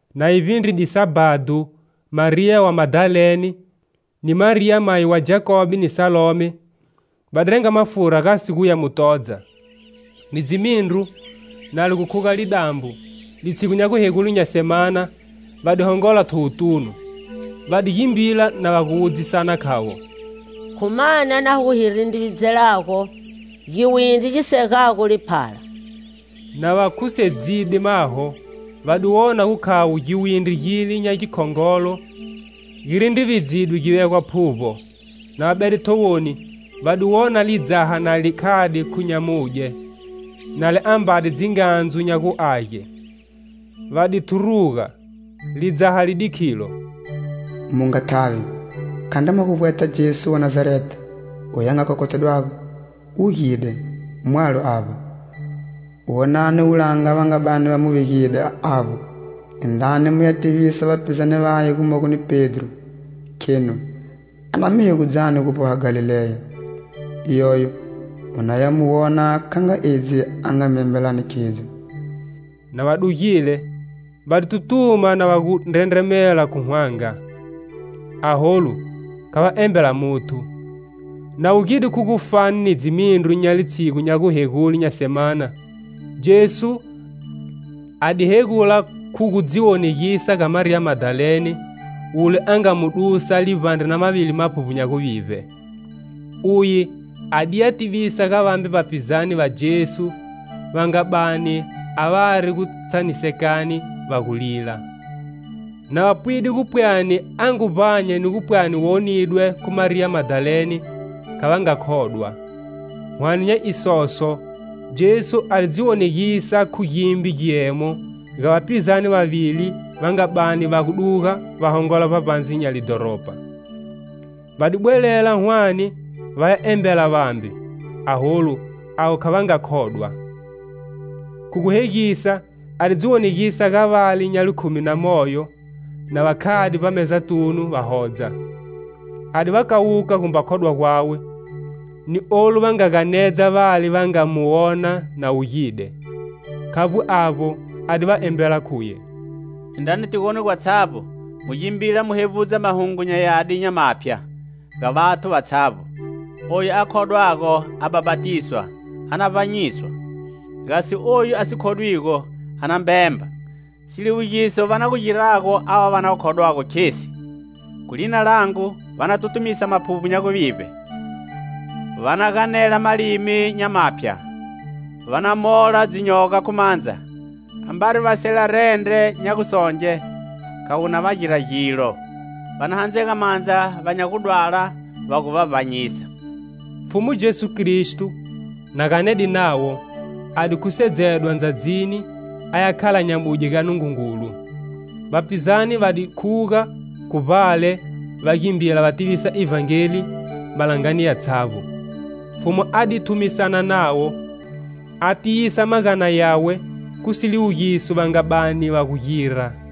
Na yi vbindrile Sabhado Mariya wa Madalene, ni Mariya mayi wa Jakobe ni Salome, va di renga mafura gasi guya mu todza. Ni dzimindru, na li gu khuga lidambo, litshigu nya guhegule nya semana, va di hongola thowotunu. Va di gimbila na va gu wudzisana khavo: "Khu mani a na gu hi rindrividzelago giwindri gi segago liphala?" Na va khusedzide maho, va di wona gu khavo giwindri gile nya gikhongolo gi rindrividzidwe gi vegwa phuvbo. Na va bede thowoni, va di wona lidzaha na li khade khu nyamudye, na li ambade dzingandzu nya guage. Va di thuruga. Lidzaha li di khilo: "Mu nga thavi, khandri mwa gu vbweta Jesu wa Nazareta, oyu a nga khokhothedwago. Wugide, mwalo avba. Wonani wulanga va nga bani va mu vegide avbo. Indrani muya tivisa vapizane vaye gumogo ni Pedro, khenu a na mi hegudzani gu vboha Galileya. Iyoyo mu na ya mu wona kha nga edzi a nga mi embelani khidzo." Na va dugile, va di tutuma na va gu ndrendremela khu hwanga, aholu kha va embela muthu. [ Na wugide khu gufani ni dzimindru nya litshigu nya gu hegule nya semana Jesu a di hegula khu gu dzi wonegisa ga Mariya Madalene, wule a nga mu dusa livbandre na mavili maphuvbo nya guvivbe. Uye adiya tivisa ga vambe vapizane va Jesu va nga bani a vari gutshanisekani va gu lila. Na va pwide gu pwani a ngu vbanya ni gu pwani wonidwe khu Mariya Madalene, kha va nga khodwa. Hwane nya isoso, Jesu a di dzi wonegisa khu gimbe giemo ga vapizane vavili va nga bani va gu duga va hongola vbavbandze nya lidhoropa. Va di bwelela hwane va ya embela vambe, aholu avo kha va nga khodwa. Khu gu hegisa a di dziwonegisa ga vale nya likhumi na moyo na va khade vbamezatunu va hodza. A di va kawuka gumba khodwa gwawe, ni olu va nga ganedza vale va nga mu wona na wugide. Khavbo avbo, a di va embela khuye: "Indrani tigoni gwatshavbo, mu gimbila mu hevbudza Mahungu nya Yadi nya maphya ga vathu vatshavbo. Oyu a khodwago a bhapatiswa, a na vbanyiswa; gasi oyu a si khodwigo a na mbemba. Siliwugiso va na gu girago ava va na khodwago khesi: khu lina langu va na tutumisa maphuvbo nya guvivbe, va na ganela malimi nya maphya, va na mola dzinyoga khu mandza; ambari va sela rendre nya gusonge, kha wu na va gira gilo; va na handzega mandza va nya gudwala, va gu va vbanyisa." Pfhumu Jesu Kristo, na ganede navo, a di khusedzedwa ndzadzini, aya khala nyamudye ga Nungungulu. Vapizane va di khuga khu vbale va gimbila va tivisa Ivhangeli malangani yatshavbo. Pfhumu a di thumisana navo, a tiyisa magana yawe khu siliwugiso va nga bani va gu gira.]